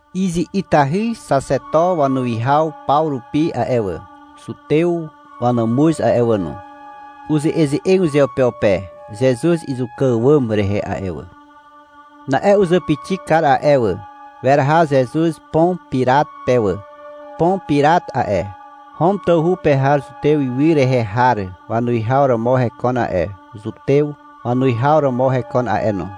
Izi'itahy xaxeto wanuwihaw paw rupi a'e wà, Zutew wanàmuz a'e wà no, uze'eze'eg uzeupeupe Zezuz izuka àwàm rehe a'e wà. Na'e uzàpixi kar a'e wà. Weraha Zezuz Pon Pirat pe wà. Pon Pirat a'e, Hom tawhu pe har Zutez ywy rehe har wanuwihaw romo hekon a'e, Zutew wanuwihaw romo hekon a'e no.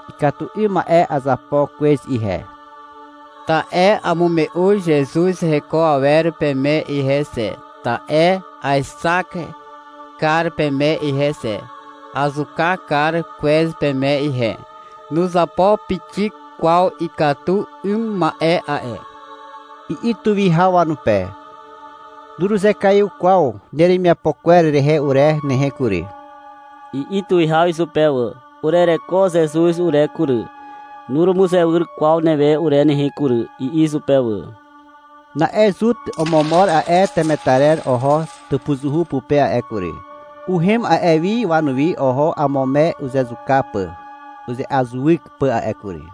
— Ikatu 'ym ma'e azapo kwez ihe, ta'e amume'u Zezuz heko awer peme ihe xe, ta'e aexak kar peme ihe xe. Azuka kar kwez peme ihe. Nuzapo pixik kwaw ikatu 'ym ma'e a'e, i'i tuwihaw wanupe. — Nuruzekaiw kwaw neremiapo kwer rehe ure nehe kury, i'i tuwihaw izupe wà. (— Urereko Zezuz ure kury, nurumuzewyr kwaw newe ure nehe kury, i'i izupe wà.) Na'e Zut omomor a'e temetarer oho tàpuzuhu pupe a'e kury. Uhem a'e wi wanuwi. Oho amo me uzezuka pà, uze'azuwyk pà a'e kury.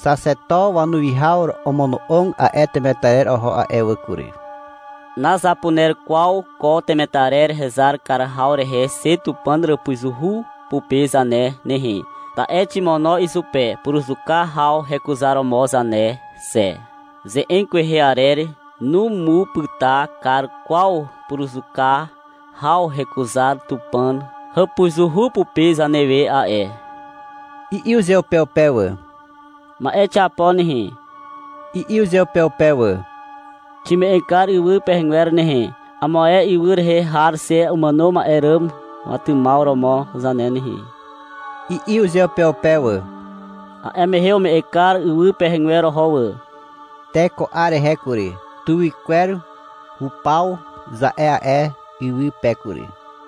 Xaxeto wanuwihaw omono'og a'e temetarer oho a'e wà kury. — Nazapuner kwaw ko temetarer hezar kar haw rehe xe Tupàn hàpuzuhu pupe zane nehe, ta'e ximono izupe puruzuka haw hekuzaromo zane xe. Ze'eg kwehe arer numupyta kar kwaw puruzuka haw hekuzar Tupàn hàpuzuhu pupe zanewe a'e, i'i uzeupeupe wà. — Ma'e xiapo nehe, i'i uzeupeupe wà. — Xime'eg kar ywy pehegwer nehe, amo ae ywy rehe har xe umàno ma'e ràm watymaw romo zane nehe, i'i uzeupeupe wà. A'e mehe ume'eg kar ywy pehegwer oho wà. Te ko 'ar rehe kury, — Tuwykwer hupaw, za'e a'e ywy pe kury.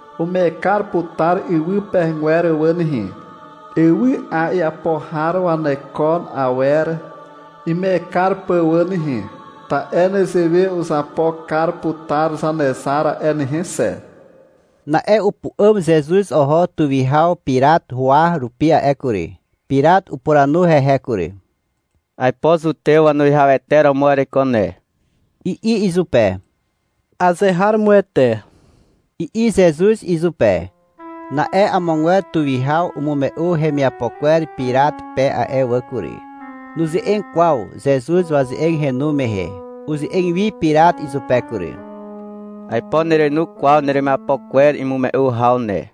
Ume'eg kar putar ywy pehegwer wà nehe, ywy'a iapo har waneko awer ime'eg kar pà wà nehe. Ta'e nezewe uzapo kar putar Zanezar a'e nehe xe. Na'e upu'àm Zezuz oho tuwihaw Pirat huwa rupi a'e kury. Pirat upuranu hehe kury. — Aipo Zutew wanuwihawete romo ereiko ne, i'i izupe. — Azeharomoete, i'i Zezuz izupe. Na'e amogwer tuwihaw umume'u hemiapo kwer Pirat pe a'e wà kury. Nuze'eg kwaw Zezuz waze'eg henu mehe. Uze'eg wi Pirat izupe kury. — Aipo nerenu kwaw neremiapo kwer imume'u haw ne,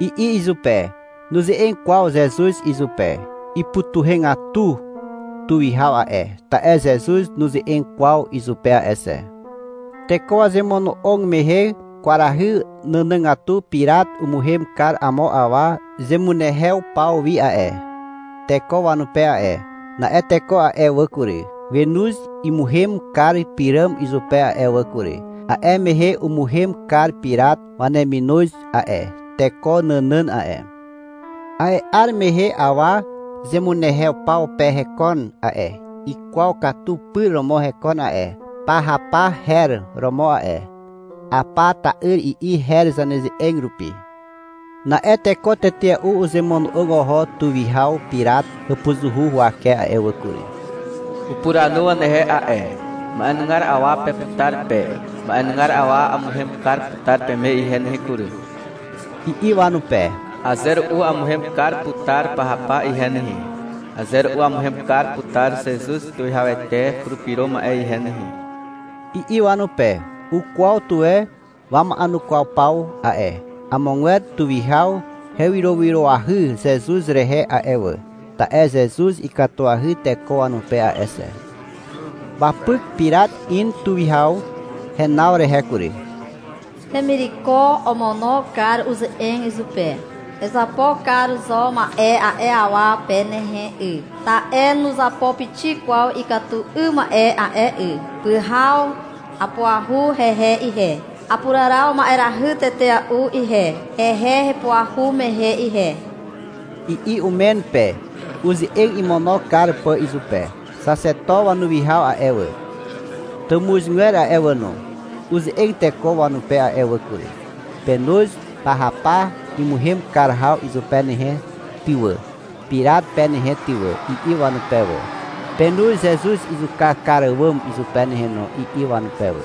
i'i izupe. Nuze'eg kwaw Zezuz izupe. Ipytuhegatu tuwihaw a'e, ta'e Zezuz nuze'eg kwaw izupe a'e xe. Teko wazemono'og mehe kwarahy nànàgatu Pirat umuhem kar amo awa zemunehew paw wi a'e, teko wanupe a'e. Na'e teko a'e wà kury, wenoz imuhem kar pyràm izupe a'e wà kury. A'e mehe umuhem kar Pirat waneminoz a'e, teko nànàn a'e. A'e 'ar mehe awa zemunehew paw pe hekon a'e. Ikwaw katu pyr romo hekon a'e. Pahapa her romo a'e. (Hapa ta'yr, i'i her zaneze'eg rupi.) Na'e teko tetea'u uzemono'og oho tuwihaw Pirat hàpuzuhu huwake a'e wà kury. Upuranu wanehe a'e. — Ma'enugar awa peputar pe. Ma'enugar awa amuhem kar putar peme ihe nehe kury, i'i wanupe. — Aze ru'u amuhem kar putar Pahapa ihe nehe. Aze ru'u amuhem kar putar Zezuz Tuwihawete Purupyro Ma'e ihe nehe, i'i wanupe. Ukwaw tuwe wama'enukwaw paw a'e. Amogwer tuwihaw hewyrowyroahy Zezuz rehe a'e wà, (ta'e Zezuz ikatuahy teko wanupe a'e xe). Wapyk Pirat in tuwihaw henaw rehe kury. Hemireko omono kar uze'eg izupe. — Ezapo kar zo ma'e a'e awa pe nehe 'y, ta'e nuzapo pixik kwaw ikatu 'ym ma'e a'e 'y. Pyhaw apuahu hehe ihe. Apuraraw ma'erahy tetea'u ihe, hehe hepuahu mehe ihe, i'i umen pe, uze'eg imono kar pà izupe. Xaxeto wanuwihaw a'e wà, tàmuzgwer a'e wà no, uze'eg teko wanupe a'e wà kury. — Penoz Pahapa imuhem kar haw izupe nehe ty wà, Pirat pe nehe ty wà, i'i wanupe wà. — Penoz Zezuz izuka kar àwàm izupe nehe no, i'i wanupe wà.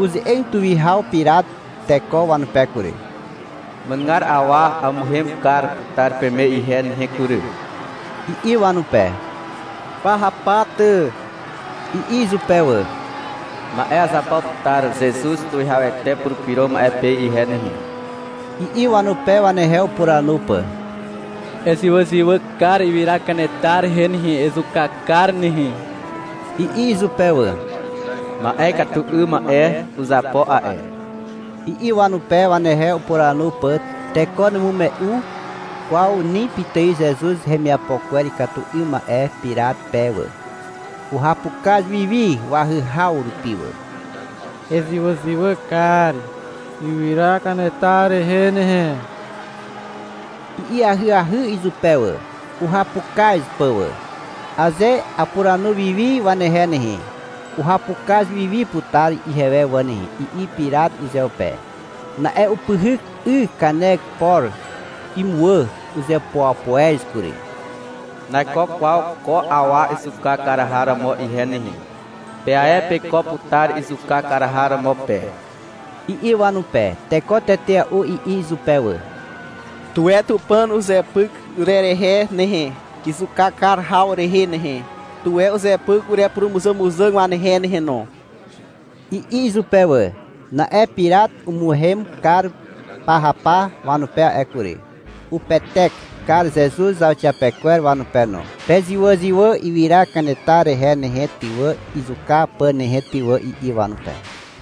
Uze'eg tuwihaw Pirat teko wanupe kury. — Ma'enugar awa amuhem kar putar peme ihe nehe kury, i'i wanupe. — Pahapa ty, i'i izupe wà. — Ma'e azapo putar Zezuz Tuwihawete Purupyro Ma'e pe ihe nehe, i'i wanupe, wanehe upuranu pà. — Ezywàzywà kar ywyra kanetar rehe nehe, ezuka kar nehe, i'i izupe wà. — Ma'e ikatu 'ym ma'e uzapo a'e, i'i wanupe, wanehe upuranu pà. Teko numume'u kwaw ni pitài Zezuz hemiapo kwer ikatu 'ym ma'e Pirat pe wà. Uhapukaz wiwi wahyhaw rupi wà. — Ezywàzywà kar ywyra kanetar rehe nehe, i'i ahyahy izupe wà, uhapukaz pà wà. — Aze apuranu wi wi wanehe nehe, uhapukaz wi wi putar ihewe wà nehe, i'i Pirat uzeupe. Na'e upyhyk 'y kanek por imuwà. Uzepoepoez kury. — Naiko kwaw ko awa izuka kar har romo ihe nehe. Pe ae peiko putar izuka kar har romo pe, i'i wanupe. Teko tetea'u i'i izupe wà. — Tuwe Tupàn uzepyk urerehe nehe, izuka kar haw rehe nehe. Tuwe uzepyk urepurumuzàmuzàg wanehe nehe no, i'i izupe wà. Na'e Pirat umuhem kar Pahapa wanupe a'e kury. Upetek kar Zezuz zauxiapekwer wanupe no. — Pezywàzywà ywyra kanetar rehe nehe ty wà, izuka pà nehe ty wà, i'i wanupe.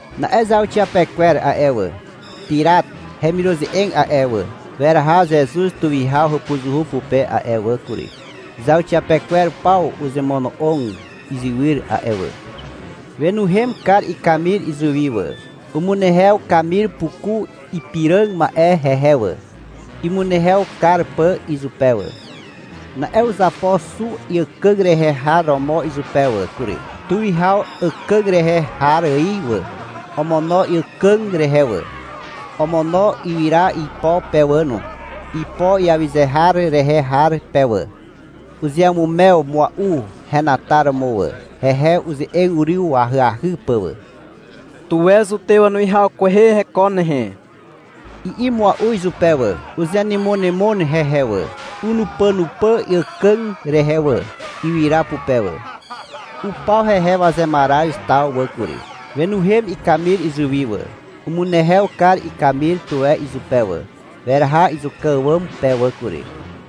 Na'e zauxiapekwer a'e wà, Pirat hemiruze'eg a'e wà, weraha Zezuz tuwihaw hàpuzuhu pupe a'e wà kury. Zauxiapekwer paw uzemono'og izywyr a'e wà. Wenuhem kar ikamir izuwi wà. Umunehew kamir puku ipiràg ma'e hehe wà, imunehew kar pà izupe wà. Na'e uzapo xu iàkàg rehe har romo izupe wà kury, tuwihaw àkàg rehe har ài wà. Omono iàkàg rehe wà. Omono ywyra ipo pe wà no, ipo iawyze har rehe har pe wà. Uzeamumew mua'u henataromo wà, hehe uze'eg uryw ahyahy pà wà. — Tuwe Zutew wanuwihaw kwehe hekon nehe, i'i mua'u izupe wà. Uzenymonymon hehe wà. Unupànupà iàkàg rehe wà, ywyra pupe wà. Upaw hehe wazemaraz taw wà kury. Wenuhem ikamir izuwi wà. Umunehew kar ikamir tuwe izupe wà. Weraha izuka àwàm pe wà kury,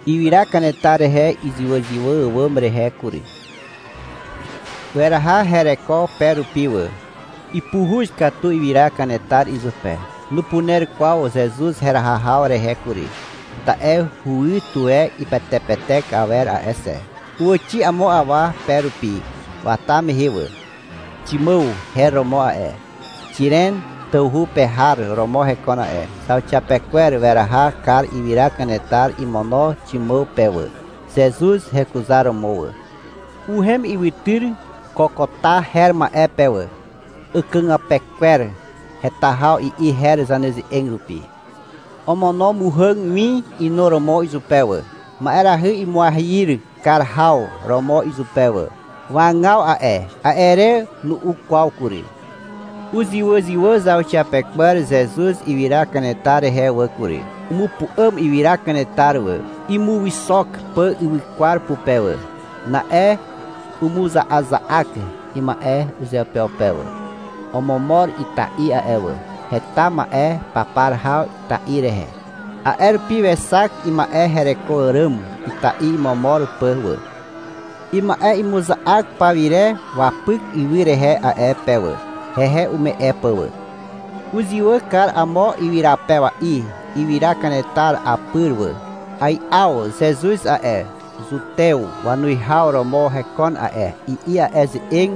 ywyra kanetar rehe izywàzywà àwàm rehe kury. Weraha hereko pe rupi wà. (Ipuhuz katu ywyra kanetar izupe. Nupuner kwaw Zezuz heraha haw rehe kury, ta'e huwy tuwe ipetepetek awer a'e xe.) Uwàxi amo awa pe rupi wata mehe wà. Ximàw her romo a'e, Xiren tawhu pe har romo hekon a'e. Zauxiapekwer weraha kar ywyra kanetar imono Ximàw pe wà, Zezuz hekuzaromo wà. Uhem ywytyr Kokota her ma'e pe wà. Àkàgàpe kwer heta haw i'i her zaneze'eg rupi. Omono muhàg win inuromo izupe wà, ma'erahy imuahyir kar haw romo izupe wà. Wagaw a'e. A'e re nu'u kwaw kury. Uzywàzywà zauxiapekwer Zezuz ywyra kanetar rehe wà kury. Umupu'àm ywyra kanetar wà, imuwyxok pà ywykwar pupe wà. Na'e umuza'aza'ak ima'e uzeupeupe wà. Omomor ita'i a'e wà. Heta ma'e papar haw ita'i rehe. A'e rupi wexak ima'e hereko àràm ita'i imomor pà wà. Ima'e imuza'ak pawire wapyk ywy rehe a'e pe wà, hehe ume'e pà wà. Uzywà kar amo ywyrapewa'i ywyra kanetar apyr wà. — Ai'aw Zezuz a'e, Zutew wanuwihaw romo hekon a'e, i'i a'e ze'eg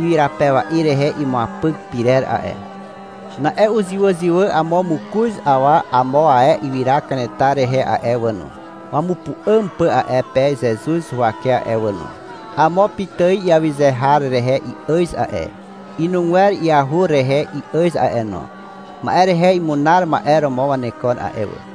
ywyrapewa'i rehe imuapyk pyrer a'e. Na'e uzywàzywà amo mokoz awa amo ae ywyra kanetar rehe a'e wà no, wamupu'àm pà a'e pe Zezuz huwake a'e wà no. Amo pitài iawyze har rehe i'àz a'e, inugwer iahur rehe i'àz a'e no. Ma'e rehe imunar ma'e romo wanekon a'e wà.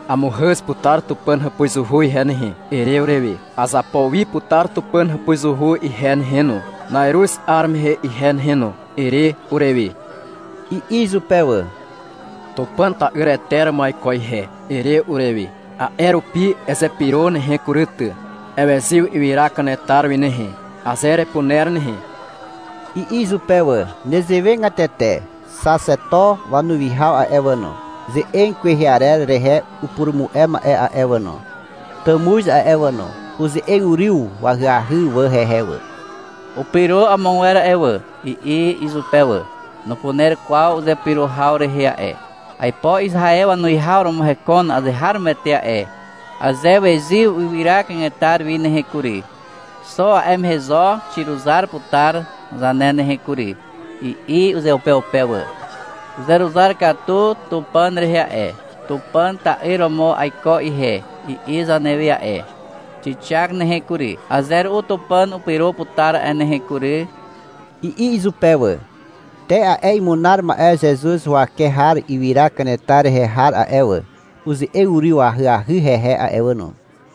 — Amuhàz putar Tupàn hàpuzuhu ihe nehe, ere urewe. — Azapo wi putar Tupàn hàpuzuhu ihe nehe no, na'iruz 'ar mehe ihe nehe no, ere urewe, i'i izupe wà. — Tupàn ta'yrete romo aiko ihe, ere urewe. A'e rupi ezepyro nehe kury ty. Ewezyw ywyra kanetar wi nehe, aze erepuner nehe, i'i izupe wà. Nezewegatete xaxeto wanuwihaw a'e wà no, ze'eg kwehe arer rehe upurumu'e ma'e a'e wà no, tàmuz a'e wà no, uze'eg uryw ahyahy wà hehe wà. — Upyro amogwer a'e wà, i'i izupe wà. — Nupuner kwaw uzepyro haw rehe a'e. Aipo Izaew wanuwihaw romo hekon azeharomoete a'e. Aze wezyw ywyra kanetar wi nehe kury, xo a'e mehe zo xiruzar putar zane nehe kury, i'i uzeupeupe wà. — Uzeruzar katu Tupàn rehe a'e. — Tupàn ta'yr romo aiko ihe, i'i zanewe a'e. Xixak nehe kury. Aze ru'u Tupàn upyro putar a'e nehe kury, i'i izupe wà. Te a'e imunar ma'e Zezuz huwake har ywyra kanetar rehe har a'e wà, uze'eg uryw ahyahy hehe a'e wà no.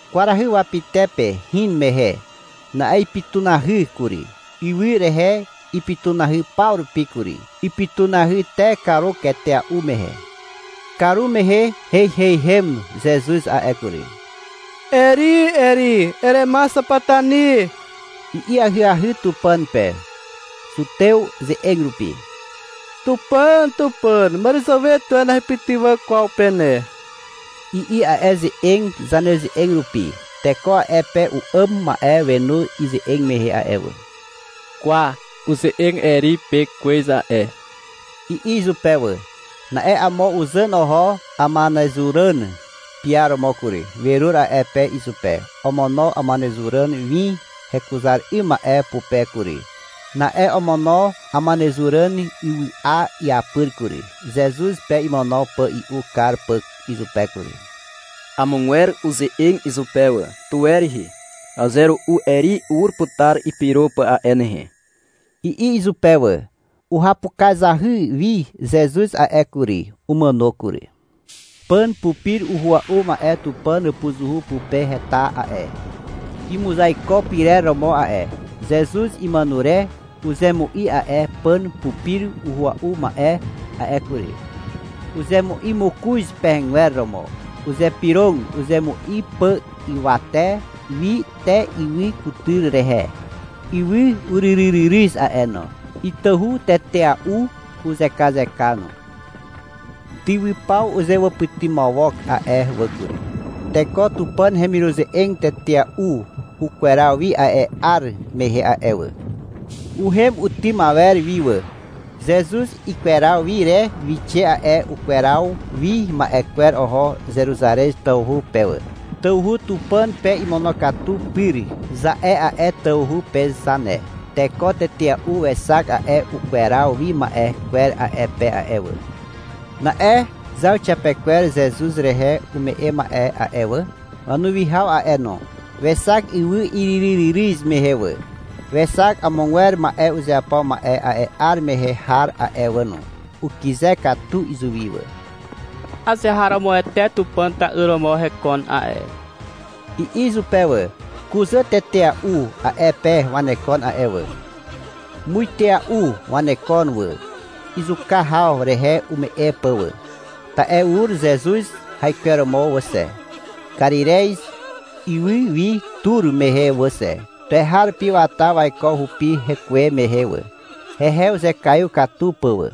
Kwarahy wapytepe hin mehe. Na'e ipytunahy kury. Ywy rehe ipytunahy paw rupi kury. Ipytunahy te karuk etea'u mehe. Karumehe heiheihem Zezuz a'e kury. — Eri, Eri, erema xapatani, i'i ahyahy Tupàn pe Zutew ze'eg rupi. — Tupàn, Tupàn, màràzàwe tuwe nahepytywà kwaw pe ne, i'i a'e ze'eg zaneze'eg rupi. Teko a'e pe u'àm ma'e wenu ize'eg mehe a'e wà. — Kwa, uze'eg Eri pe kwez a'e, i'i izupe wà. Na'e amo uzàn oho amanezuràn piaromo kury. Werur a'e pe izupe. Omono amanezuràn win hekuzar 'ym ma'e pupe kury. Na'e omono amanezuràn wywa iapyr kury, Zezuz pe imono pà i'u kar pà izupe kury. Amogwer uze'eg izupe wà. — Tuwe rihi. Aze ru'u Eri ur putar ipyro pà a'e nehe, i'i izupe wà. Uhapukazahy wi Zezuz a'e kury. Umàno kury. Pàn pupir uhua'u ma'e Tupàn hàpuzuhu pupe heta a'e, imuzaiko pyrer romo a'e. Zezuz imàno re uzemu'i a'e pàn pupir uhua'u ma'e a'e kury. Uzemu'i mokoz pehegwer romo. Uzypyrog uzemu'i pà ywate wi te ywy kutyr rehe. Ywy uryryryryz a'e no. Itahu tetea'u uzekazeka no. Tywypaw uzewàpytymawok a'e wà kury. Teko Tupàn hemiruze'eg tetea'u ukweraw wi a'e 'ar mehe a'e wà. Uhem utym awer wi wà. Zezuz ikweraw wi re wixe a'e ukweraw wi ma'e kwer oho Zeruzarez tawhu pe wà. (— Tawhu Tupàn pe imonokatu pyr, za'e a'e tawhu pe zane.) Teko tetea'u wexak a'e ukweraw wi ma'e kwer a'e pe a'e wà. Na'e zauxiapekwer Zezuz rehe ume'e ma'e a'e wà, wanuwihaw a'e no, wexak ywy iryryryryz mehe wà. Wexak amogwer ma'e uzeapo ma'e a'e 'ar mehe har a'e wà no. Ukyze katu izuwi wà. — Azeharomoete Tupàn ta'yr romo hekon a'e, i'i izupe wà. Kuzà tetea'u a'e pe wanekon a'e wà. Muitea'u wanekon wà, izuka haw rehe ume'e pà wà. Ta'e ur Zezuz haikweromo wà xe, Karirez ywy wi tur mehe wà xe. Tuweharupi wata waiko hupi hekuwe mehe wà, hehe uzekaiw katu pà wà.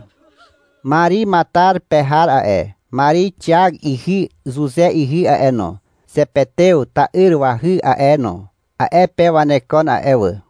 Mari Matar pe har a'e, Mari Xiak ihy Zuze ihy a'e no, Zepetew ta'yr wahy a'e no, a'e pe wanekon a'e wà.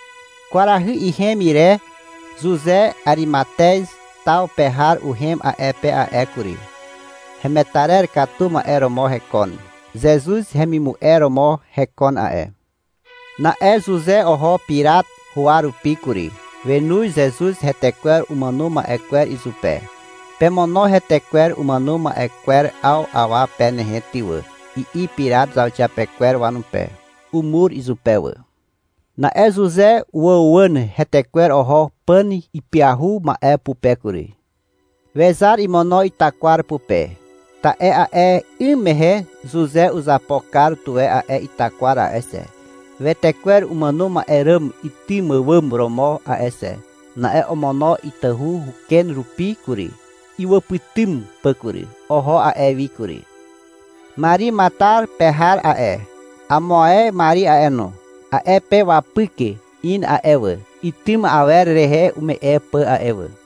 Kwarahy ihem ire Zuze Arimatez taw pe har uhem a'e pe a'e kury. Hemetarer katu ma'e romo hekon. Zezuz hemimu'e romo hekon a'e. Na'e Zuze oho Pirat huwa rupi kury. Wenoz Zezuz hetekwer umàno ma'e kwer izupe. — Pemono hetekwer umàno ma'e kwer 'aw awa pe nehe ty wà, i'i Pirat zauxiapekwer wanupe. Umur izupe wà. Na'e Zuze uwàuwàn hetekwer oho pàn ipyahu ma'e pupe kury. Wezar imono itakwar pupe. Ta'e a'e 'ym mehe Zuze uzapo kar tuwe a'e itakwar a'e xe, wetekwer umàno ma'e ràm itym àwàm romo a'e xe. Na'e omono itahu uken rupi kury, iwàpytym pà kury. Oho a'e wi kury. Mari Matar pe har a'e, amo ae Mari a'e no, a'e pe wapyk in a'e wà, itym awer rehe ume'e pà a'e wà.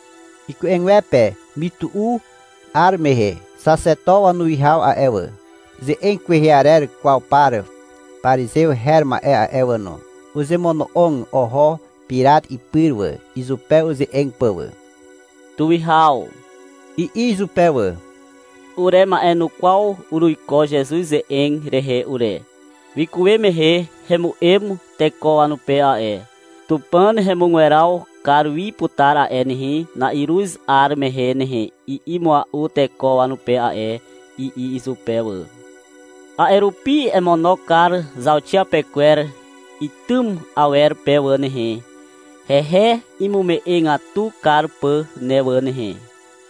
Iku'egwepe mytu'u 'ar mehe, xaxeto wanuwihaw a'e wà, ze'eg kwehe arer kwaw par parizew her ma'e a'e wà no, uzemono'og oho Pirat ipyr wà, izupe uze'eg pà wà. — Tuwihaw, i'i izupe wà. — Urema'enukwaw uruiko Zezuz ze'eg rehe ure. Wikuwe mehe hemu'em teko wanupe a'e. — Tupàn hemugweraw kar wi putar a'e nehe, na'iruz 'ar mehe nehe, i'i mua'u teko wanupe a'e, i'i izupe wà. — A'e rupi emono kar zauxiapekwer itym awer pe ne wà nehe, hehe imume'egatu kar pà ne wà nehe.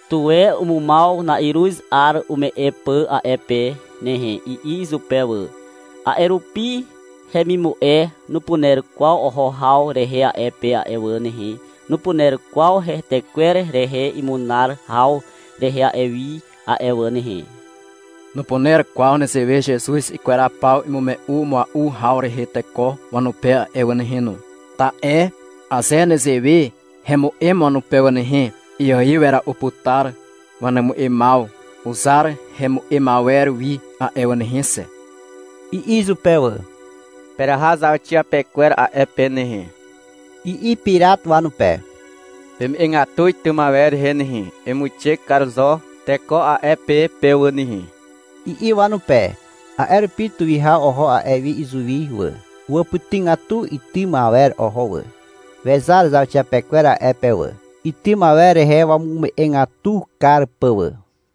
Tuwe umumaw na'iruz 'ar ume'e pà a'e pe nehe, i'i izupe wà. — A'e rupi hemimu'e nupuner kwaw oho haw rehe a'e pe a'e wà nehe, nupuner kwaw hetekwer rehe imunar haw rehe a'e wi a'e wà nehe. Nupuner kwaw nezewe Zezuz ikweraw paw imume'u mua'u haw rehe teko wanupe a'e wà nehe no. Ta'e aze nezewe hemu'em wanupe wà nehe, iaiw wera'u putar wanemu'emaw uzar hemu'em awer wi a'e wà nehe xe, i'i izupe wà. — Peraha zauxiapekwer a'e pe nehe, i'i Pirat wanupe. — Peme'egatu itym awer rehe nehe, emuixe kar zo teko a'e pe pe wà nehe, i'i wanupe. A'e rupi tuwihaw oho a'e wi izuwi wà. Uwàpytygatu itym awer oho wà. Wezar zauxiapekwer a'e pe wà, itym awer rehe wamume'egatu kar pà wà.